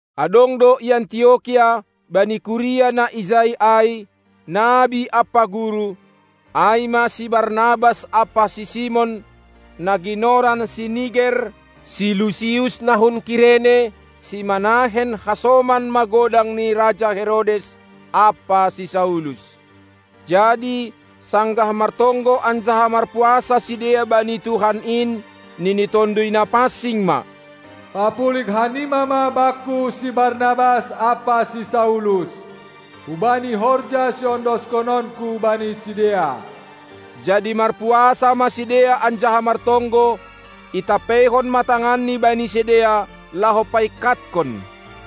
Adong do i Antiokia, bani kuria na ijai ai, nabi ampa guru, ai ma si Barnabas ampa si Simon, na ginoran si Niger, si Lucius na hun Kirene, si Manahen hasoman magodang ni raja Herodes ampa si Saulus. Jadi sanggah martonggo anjaha marpuasa sidea bani Tuhan in, nini Tonduy Napansing ma: Papulig hanima ma Bakku si Barnabas ampa si Saulus hubani horja siondoskononKu bani sidea. Jadi marpuasa ma sidea anjaha martonggo, itampeihon ma tanganni bani sidea, laho paingkathon.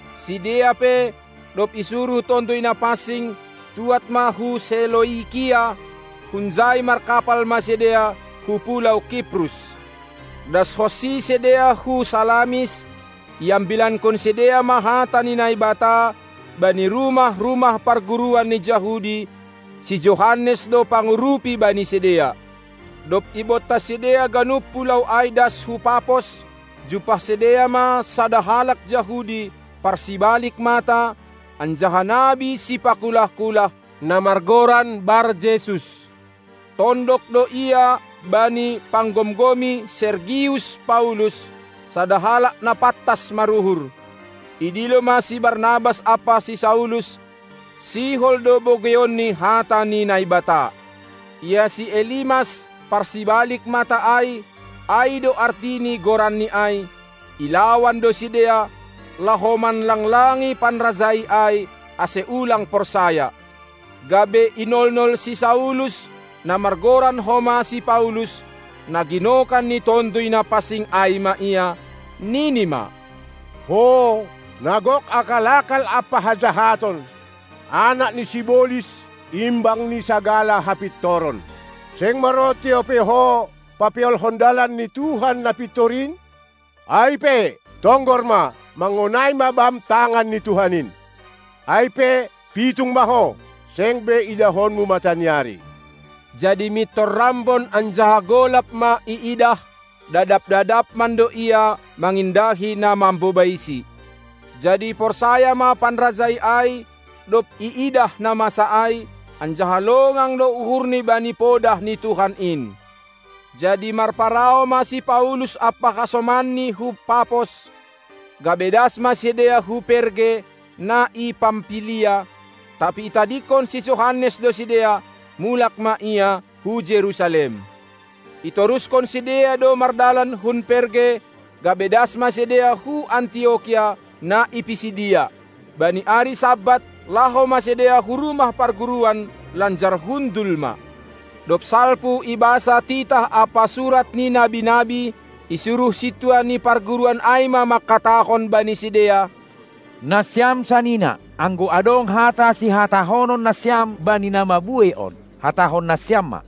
Sidea pe, dob isuruh Tonduy Napansing, tuad ma hu Seloikia; hunjai markapal ma sidea hu pulou Kiprus. Dashonsi sidea hu Salamis, iambilankon sidea ma hata ni Naibata bani rumah-rumah parguruan ni Jahudi; si Johannes do pangurupi bani sidea. Dob ibontas sidea ganup pulou ai das hu Papos, jumpah sidea ma sada halak Jahudi, parsibalik mata anjaha nabi sipakulah-kulah, na margoran Bar-Jesus. Tondok do ia bani panggomgomi Sergius-Paulus, sada halak na pantas maruhur. Idilo ma si Barnabas ampa si Saulus, sihol do bogeionni hata ni Naibata. Ia si Elimas, parsibalik mata ai (ai do arti ni goranni ai), ilawan do sidea, laho manlanglangi panrajai ai, ase ulang porsaya. Gabe inolnol si Saulus, na margoran homa si Paulus, na ginokan ni Tonduy Napansing ai ma ia, nini ma: Ho, na gok akal-akal ampa hajahaton, anak ni sibolis, imbang ni sagala hapintoron! Seng maronti ope ho, papeolhon dalan ni Tuhan na pintor in? Ai pe, tonggor ma, mangonai ma bam tangan ni Tuhan in! Ai pe pitung ma ho, seng be idahonmu mataniari. Jadi mintor rambon anjaha golap ma iidah, dadap-dadap mando ia mangindahi na mambobaisi. Jadi porsaya ma panrajai ai, dob iidah na masa ai, anjaha longang do uhurni bani podah ni Tuhan in. Jadi marparau ma si Paulus ampa hasomanni hun Papos, gabe das ma sidea hu Perge, na i Pampilia. Tapi itadingkon si Johannes do sidea, mulak ma ia hu Jerusalem. Itoruskon sidea do mardalan hun Perge, gabe das ma sidea hu Antiokia, na i Pisidia. Bani ari Sabat, laho ma sidea hu rumah parguruan lanjar hundul ma. Dob salpu ibasa titah ampa surat ni nabi-nabi, isuruh sintua ni parguruan ai ma mangkatahon bani sidea: Nasiam sanina, anggo adong hata sihatahonon nasiam bani na mabuei on, hatahon nasiam ma!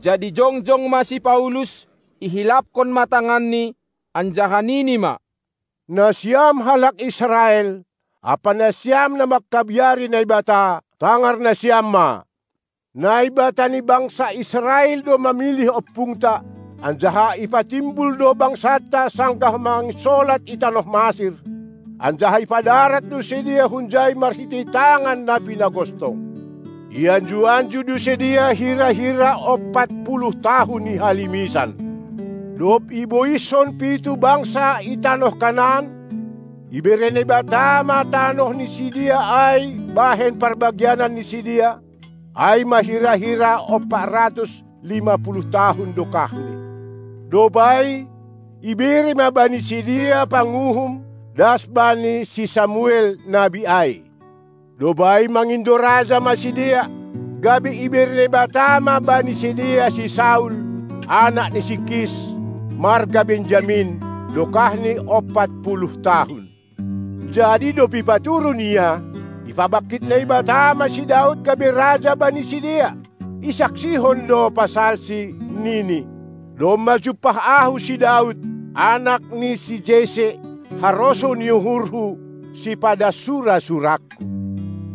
Jadi jongjong ma si Paulus, ihilaphon ma tanganni anjaha nini ma: Nasiam halak Israel ampa nasiam na mangkabiari Naibata, tangar nasiam ma! Naibata ni bangsa Israel do mamilih ompungta, anjaha ipatimbul do bangsanta sanggah manginsolat i tanoh Masir, anjaha ipadarat do sidea hunjai marhitei tangan na pinagostong. Ianju-anju do sidea hira-hira ompat puluh tahun i halimisan. Dob iboiskon pitu bangsa i tanoh Kanaan, ibere Naibata ma tanoh ni sidea ai bahen parbagianan ni sidea, ai ma hira-hira ompat ratus lima puluh tahun dokahni. Dob ai, ibere ma bani sidea panguhum das bani si Samuel, nabi ai. Dob ai mangindo raja ma sidea, gabe ibere Naibata ma bani sidea si Saul, anak ni si Kis, marga Benyamin, dokahni ompat puluh tahun. Jadi dob ipaturun ia, ipabangkit Naibata ma si Daud gabe raja bani sidea, isaksihon do pasalsi, nini: Domma jumpah Ahu si Daud, anak ni si Jesse, harosuh ni uhurHu, sipadas sura-surangKu.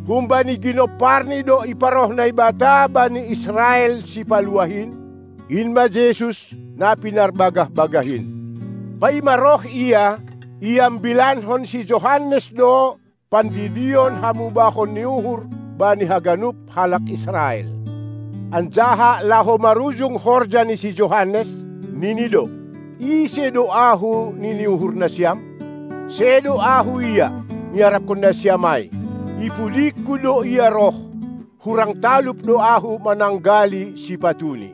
Humbani ginomparni do iparoh Naibata bani Israel sipaluah in, in ma Jesus, na pinarbagah-bagah in. Paima roh Ia, iambilankon si Johannes do pandidion hamubahon ni uhur bani haganup halak Israel. Anjaha laho marujung horja ni si Johannes, nini do: Ise do ahu nini uhur nasiam? Sedo ahu Ia, niarapkon nasiam ai. I pudingku do Ia roh, hurang talup do ahu mananggali sipatuNi.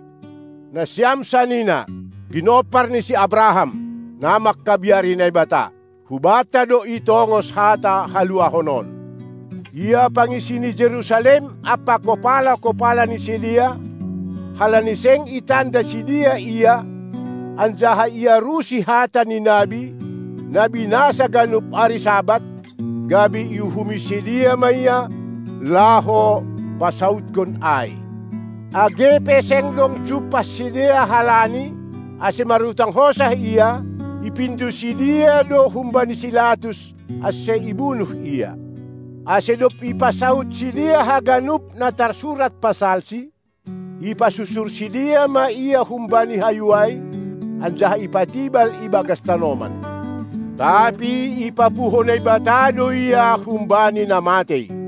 Nasiam sanina, ginompar ni si Abraham, na mangkabiari Naibata! Hubanta do itongos hata haluahon on. Ia pangisi ni Jerusalem ampa kopala-kopala ni sidea, halani seng itanda sidea Ia anjaha iarusi hata ni nabi, na binasa ganup ari Sabat, gabe iuhumi sidea ma Ia, laho pasaudkon ai. Age pe seng dong jumpah sidea halani, ase marutang hosah Ia, ipindo sidea do humbani si Latus ase ibunuh ia. Ase dob ipasaud sidea haganup na tarsurat pasalsi, ipasusur sidea ma Ia humbani hayu ai, anjaha ipatibal i bagas tanoman. Tapi ipapuho Naibata do Ia humbani na matei.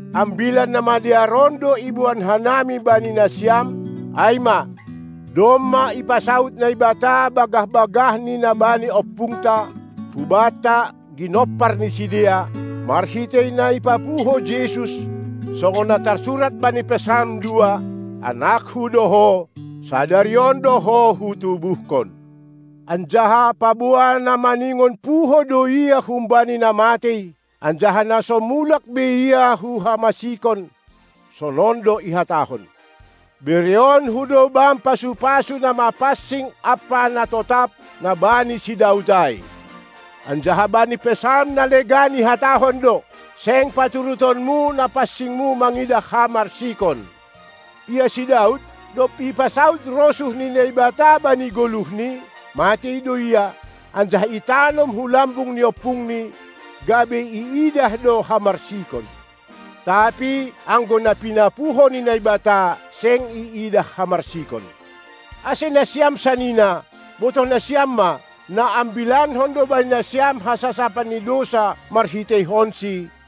Ambilan namadear on do iboan hanami bani nasiam, ai ma: Domma ipasaud Naibata bagah-bagahNi na bani ompungta, hubanta, ginompar ni sidea, marhitei na ipapuho Jesus, songon na tarsurat bani Psalm dua: AnakKu do Ho, sadari on do Ho Hutubuhkon. Anjaha, paboa na maningon puho do Ia humbani na matei, anjaha na so mulak be Ia hu hamasikon, sonon do ihatahon: BerehononKu do Bam pasu-pasu na mapansing ampa na totap, na bani si Daud ai. Anjaha bani Psalm na legan ihatahon do: Seng paturutonmu Na pansing-Mu mangidah hamarsikon. Ia si Daud, dob ipasaud rosuh ni Naibata bani goluhni, matei do ia, anjaha itanom hu lambung ni ompungni, gabe iidah do hamarsikon. Tapi anggo na pinapuho ni Naibata, seng iidah hamarsikon. Ase nasiam sanina, botoh nasiam ma, naambilankon do bani nasiam hasasapan ni dousa marhiteihonsi,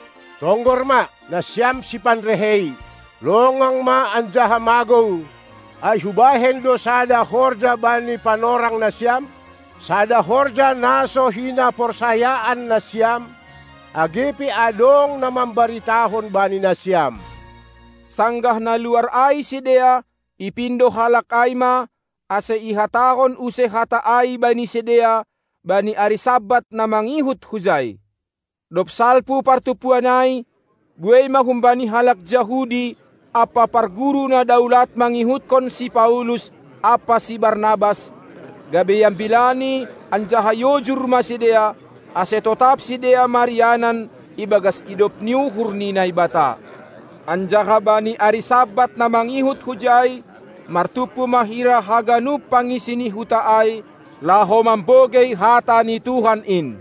Tonggor ma, nasiam sipanrehei, longang ma anjaha magou; ai hubahen do sada horja bani panorang nasiam, sada horja na so hinaporsayaan nasiam, age pe adong na mambaritahon bani nasiam! Sanggah na luar ai sidea, ipindo halak ai ma, ase ihatahon use hata ai bani sidea bani ari Sabat na mangihut hujai. Dob salpu partumpuan ai, buei ma humbani halak Jahudi ampa parguru na daulat mangihutkon si Paulus ampa si Barnabas, gabe iambilani anjaha iojur ma sidea, ase totap sidea marianan ibagas idop ni uhur ni Naibata. Anjaha bani ari Sabat na mangihut hujai, martumpu ma hira haganup pangisi ni huta ai, laho mambogei hata ni Tuhan in.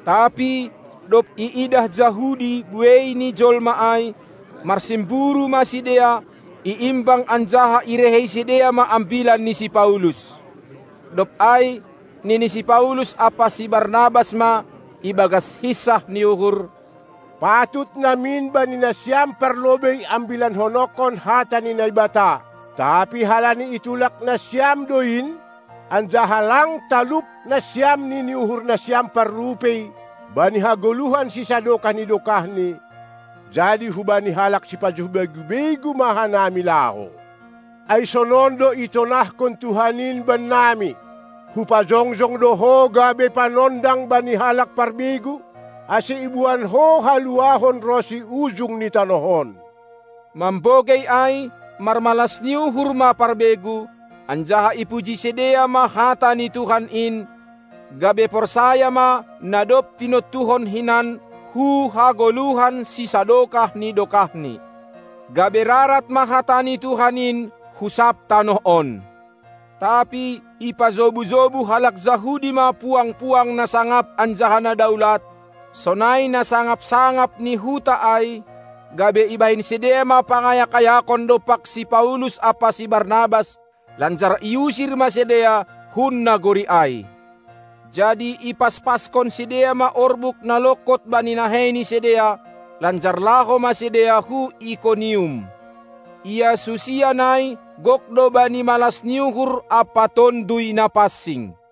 Tapi dob iidah Jahudi buei ni jolma ai, marsimburu ma sidea, iimbang anjaha irehei sidea ma ambilan ni si Paulus. Dob ai nini si Paulus ampa si Barnabas ma ibagas hinsah ni uhur: Patut namin bani nasiam parlobei ambilanhononkon hata ni Naibata; tapi halani itulak nasiam do in, anjaha lang talup nasiam nini uhurnasiam parrupei bani hagoluhan sisadokah ni dokahni, jadi hubani halak sipajuh begu-begu ma hanami laho. Ai sonon do itonahkon Tuhan in bennami: Hupajongjong do ho gabe panondang bani halak parbegu, ase iboan ho haluahon ronsi ujung ni tanoh on! Mambogei ai marmalas ni uhur ma parbegu, anjaha ipuji sidea ma hata ni Tuhan in, gabe porsaya ma na dob tinontuhon hinan hu hagoluhan sisadokah ni dokahni. Gabe rarat ma hata ni Tuhan in hu sab tanoh on. Tapi ipajobu-jobu halak Jahudi ma puang-puang na sangap anjaha na daulat, sonai na sangap-sangap ni huta ai, gabe ibahen sidea ma pangayak-ayakon dompak si Paulus ampa si Barnabas, lanjar iusir ma sidea hun nagori ai. Jadi ipaspaskon sidea ma orbuk na longkot bani nahei ni sidea, lanjar laho ma sidea hu Ikonium. Ia susian ai gok do bani malas ni uhur ampa Tonduy Napansing.